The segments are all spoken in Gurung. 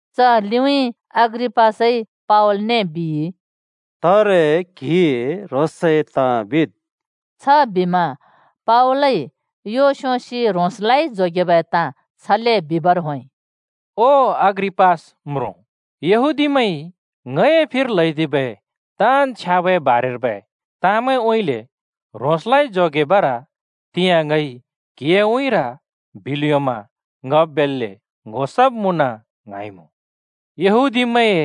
च लिउँइँ अग्रिपासइ पावलने बिइ, “तारे क्‍हिइ ह्रोंसए ताँ बिद्।” छबिमा पावलइ यो स्‍योंसि ह्रोंसलाइ जोगेबै ताँ छले बिबर होंइ, “ओ अग्रिपास म्रुँ! यहूदीमैंइ ङए फिर ल्हैदिबै ताँन् छ्याबए बारेर्बै ताँमैंउँइँले ह्रोंसलाइ जोगेबर तिंयाँ ङइ क्हिए उँइँर बिल् योंमा ङ बेल्‍ले ङ्‍हो सब् मुँन ङ्हाइमुँ! यहूदीमैंए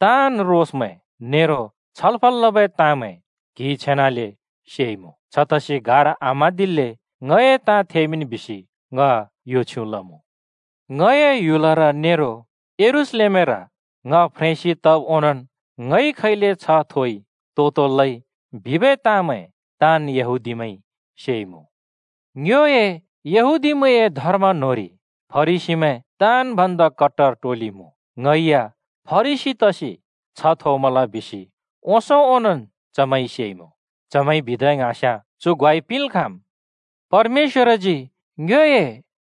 ताँन् रोसमैं नेरो छलफल लबै ताँमैं क्हिइ छेनाले सेइमुँ। छतसि गार आम्हाँदिल्‍ले ङए ताँ थेमिंन् बिसि ङ यो छ्युँ लमुँ। “ङए ह्‍युलर नेरो यरूशलेमर ङ फ्रेंसि तब् ओंनोंन् ङइ खैले छ्ह थोइ, तो-तो लइ, बिबै ताँमैं ताँन् यहूदीमैंइ सेइमुँ। ङ्योए यहूदीमैंए धर्म न्होंरि फरिसीमैं ताँन् भन्दा कट्टर टोलि मुँ। ङै या फरिसी तसि छ्ह थोमल बिसि ओंसों ओनोंन् चमैंइ सेइमुँ। चमैंइ बिदा ङ्हाँस्याँ चु ग्वाइ पिंल् खाँम्। परमेश्‍वरजी ङ्योए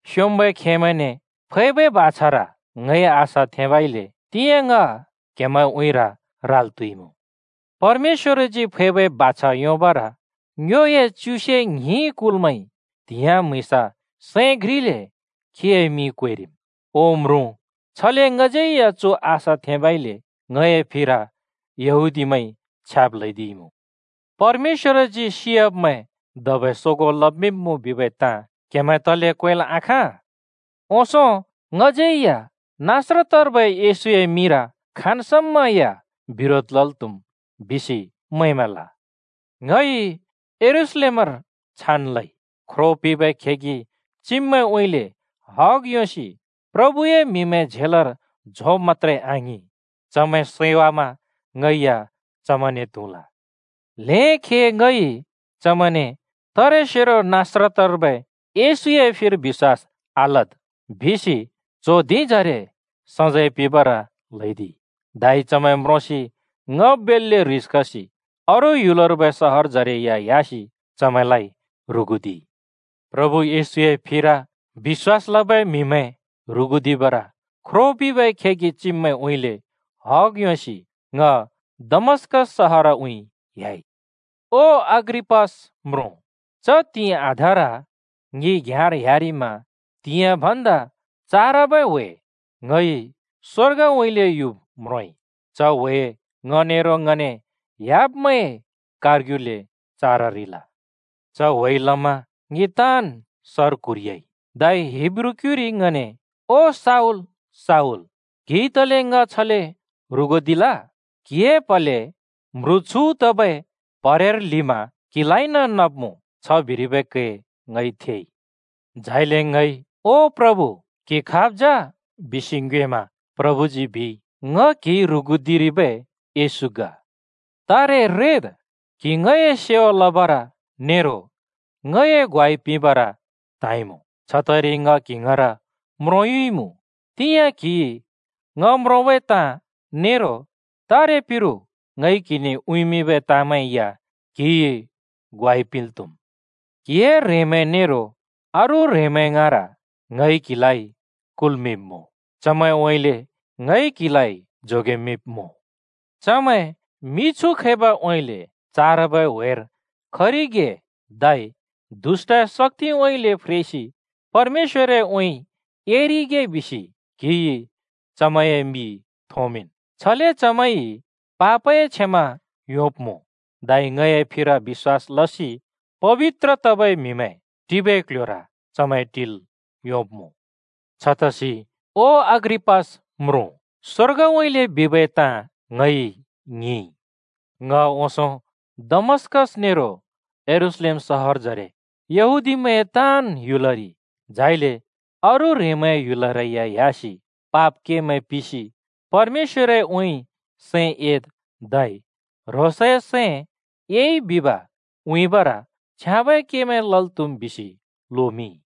स्योंम्बै खेमैंने फैबै बाछार ङइ आशा थेंबइले तिंयाँ ङ क्हेमैंए उँइँर राल् त्हुइमुँ। परमेश्‍वरजी फैबै बाछा योंबर ङ्योए च्युसे ङ्हिं कुलमैंइ त्हिंयाँ, म्हुँइँस सैं घ्रिले खीए मिं क्वेरिम्। ओ म्रुँ, छले ङज्यै या चु आशा थेंबइले ङए फिर यहूदीमैंइ छ्याब् ल्हैदिइमुँ। परमेश्‍वरजी सियाब्मैं धबै सोगों लमिंब्मुँ बिबै ताँ क्हेमैं तले क्वेंल् आखाँ? “ओंसों ङज्यै या नासरतर्बै येशूए मिंर खाँन् समा या बिरोध लल् त्हुम् बिसि मैंमल। ङइ यरूशलेमर छान् लइ। ख्रो पिंबै खेगि चिब्मैंउँइँले हग योंसि प्रभुए म्हिमैं झेलर झोंब् मत्‍त्रे आङिं, चमैं सैवामा ङै या चमैंने त्हुँल। ल्हें खे ङइ चमैंने ‘तारेसेरो नासरतर्बै येशूए फिर बिश्‍वास आलद्’ बिसि च्हों धिंजरे सजैं पिंबर ल्हैदिइ, धै चमैं म्रोंसि ङ बेल्‍ले ह्रिस खसि अरू ह्‍युलर्बै सहरजरे या ह्‍यासि चमैंलाइ ह्रुगुदिइ। “प्रभु येशूए फिर बिश्‍वास लबै म्हिमैं ह्रुगुदिबर ख्रो पिंबै खेगि चिब्मैंउँइँले हग योंसि ङ दमस्कस शहारउँइँ ह्‍याइ। ओ अग्रिपास म्रुँ, च त्हिंइ आधार ङि घ्याँर ह्‍यारिमा त्हिंयाँ भन्दा चारबै ह्‍वे ङइ स्वर्गउँइले युब म्रोंइ। च ह्‍वे ङ नेरो ङने ह्‍याब्मैंए कारग्युले चाररिल। च ह्‍वेइ लमा ङि ताँन् सर क्हुरियाइ। धै हिब्रू क्युइर ङने, ‘ओ शाऊल, शाऊल, क्हिइ तले ङ छले ह्रुगुदिरिल? क्हिए प्‍हलेइ म्ह्रु छु तबै प्हरेर ल्हिमा क्‍हिलाइन नब्मुँ,’ छ बिरिबै कै ङइ थेइ। झाइले ङइ ‘ओ प्रभु क्‍हि खाब् जा?’ बिसि ङ्योएमा प्रभुजी बिइ, ‘ङ क्हिइ ह्रुगुदिरिबै येशू ग। तारे रेद्। क्‍हि ङए सेवा लबर नेरो ङए ग्वाइ पिंबर त्हाँइमुँ। छतइरि ङ क्‍हि ङाँर म्रोंयुइमुँ। तिंयाँ क्हिइ ङ म्रोंबै ताँ नेरो तारे पिरु ङइ क्‍हिने उँइँमिंबै ताँमैं या क्‍हिइ ग्वाइ पिंल् त्हुम्। क्हिए ह्रेंमैं नेरो अरू ह्रेंमैं ङाँर ङइ क्हिलाइ कुल्मिंब्मुँ। चमैंउँइँले ङइ क्‍हिलाइ जोगेमिंब्मुँ। चमैं मिछु खैबाउँइँले चारबै व्हेर खरिगे धै दुष्‍टए शक्‍तिउँइँले फ्रेसि परमेश्‍वरउँइँ एरिगे बिसि क्हिइ चमैंए मि थोंमिंन्। छले चमैंइ पापए क्षमा योंब्मुँ धै ङए फिर बिश्‍वास लसि पबित्र तबै म्हिमैं टिबै क्ल्ह्‍योर चमैं टिल् योंब्मुँ।’ “छतसि, ओ अग्रिपास म्रुँ, स्‍वर्गउँइँले बिबै ताँ ङइ ङिंइ। ङ ओंसों डमस्‍कस नेरो यरूशलेम सहरजरे, यहूदीमैंए ताँन् ह्‍युलरि, झाइले अरू ह्रेंमैंए ह्‍युलरै या ह्‍यासि पाप केमैं पिसि परमेश्‍वरउँइँ सैं एद् धै ह्रोंसइ सैं एइ बिब उँइँबर छ्याँबै केमैं लल् त्‍हुम् बिसि लोमिंइ।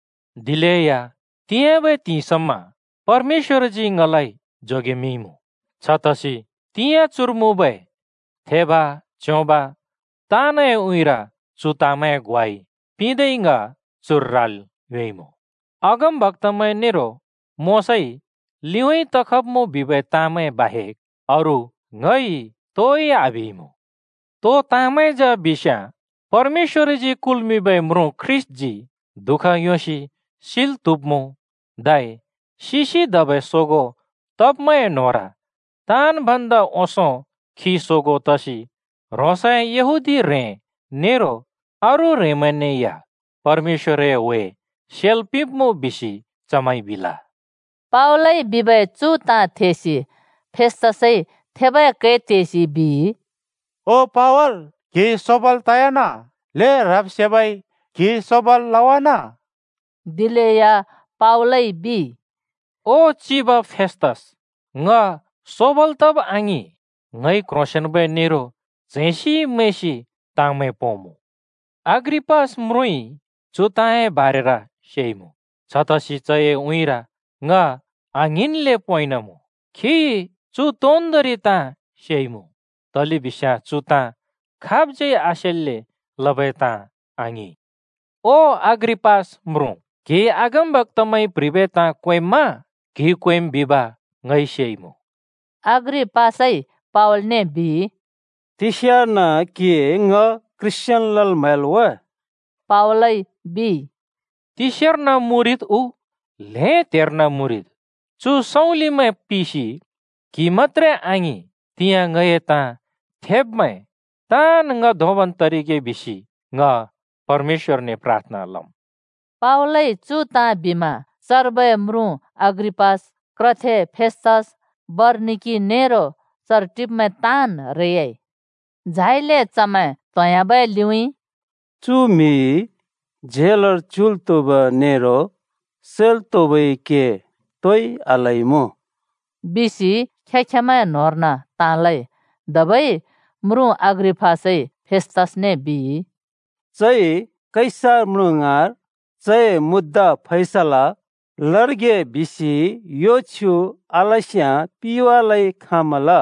दिलेया तिंयाँबै त्हिंइ समा परमेश्‍वरजी ङलाइ जोगेमिंइमुँ। छतसि तिंयाँ चुर मुँबै थेब, च्योंब, ताँनए उँइँर चु ताँमैंए ग्वाइ पिंदै ङ चुर राल् योंइमुँ। अगमबक्‍तामैं नेरो मोशाइ लिउँइँ तखब्मुँ बिबै ताँमैं बाहेक अरू ङइ तोइ आबिइमुँ। तो ताँमैं जा बिस्याँ, परमेश्‍वरजी कुल्मिंबै म्रुँ ख्रीष्‍टजी दुःख योंसि सिल् त्हुब्मुँ, धै सिसि धबै सोगों तब्मैंए न्होंर ताँन् भन्दा ओंसों खी सोगों तसि ह्रोंसए यहूदी ह्रें नेरो अरू ह्रेंमैंने या परमेश्‍वरए ह्‍वे सेल् पिंब्मुँ बिसि चमैंइ बिल।” पावलइ बिबै चु ताँ थेसि फेस्‍तसइ थेबै कै तेसि बिइ, “ओ पावल, क्‍हि सोबाल् तयाना! ल्हें ह्रब् सेबइ क्हि सोबाल् लवाना!” दिलेया पावलइ बिइ, “ओ चिब फेस्‍तस, ङ सोबाल् तब् आङिं। ङइ क्ह्रोंसेंन्बै नेरो च्हैंसि मैंसि ताँमैं पोंमुँ। अग्रिपास म्रुँइ चु ताँए बारेर सेइमुँ। छतसि चए उँइँर ङ आङ्हिंन्ले पोंइँनमुँ। खिइ चु तोन्दोंरि ताँ सेइमुँ, तलेबिस्याँ चु ताँ खाबज्यै आसेल्‍ले लबै ताँ आङिं। ओ अग्रिपास म्रुँ, क्‍हिइ अगमबक्‍तामैंइ प्ह्रिबै ताँ क्वेंम्मा? क्हिइ क्वेंम् बिब ङइ सेइमुँ।” अग्रिपासइ पावलने बिइ, “तिस्यार्न क्हिइ ङ ख्रीष्‍टियान लल् म्हैल् वा?” पावलइ बिइ, “तिस्यार्न मुरिद् उ ल्हें त्हेर्न मुरिद्, चु सँउँलिमैं पिसि, क्हि मत्‍त्रे आङिं, तिंयाँ ङए ताँ थेब्मैं ताँन् ङ धोंबन् तरिगे बिसि ङ परमेश्‍वरने प्राथना लम्।” पावलइ चु ताँ बिमा चर्बै अग्रिपास म्रुँ, क्रथे फेसतुस, बरनिकि, नेरो चर टिब्मैं ताँन् रेयाइ। झाइले चमैं त्होंह्‍याबै लिउँइँ, “चु म्हिइ झेलर च्युल् त्हुब नेरो सैल् त्हुबै के तोइ आलइमुँ,” बिसि खें-खेंमैंए न्होंर्न ताँ लइ। धबै अग्रिपास म्रुँइ फेस्तसने बिइ, “चइ कैसर म्रुँ ङाँर चए मुद्दा फैसला लरिगे बिसि यो छ्युँ आलस्याँ पिवालै खाँमल।”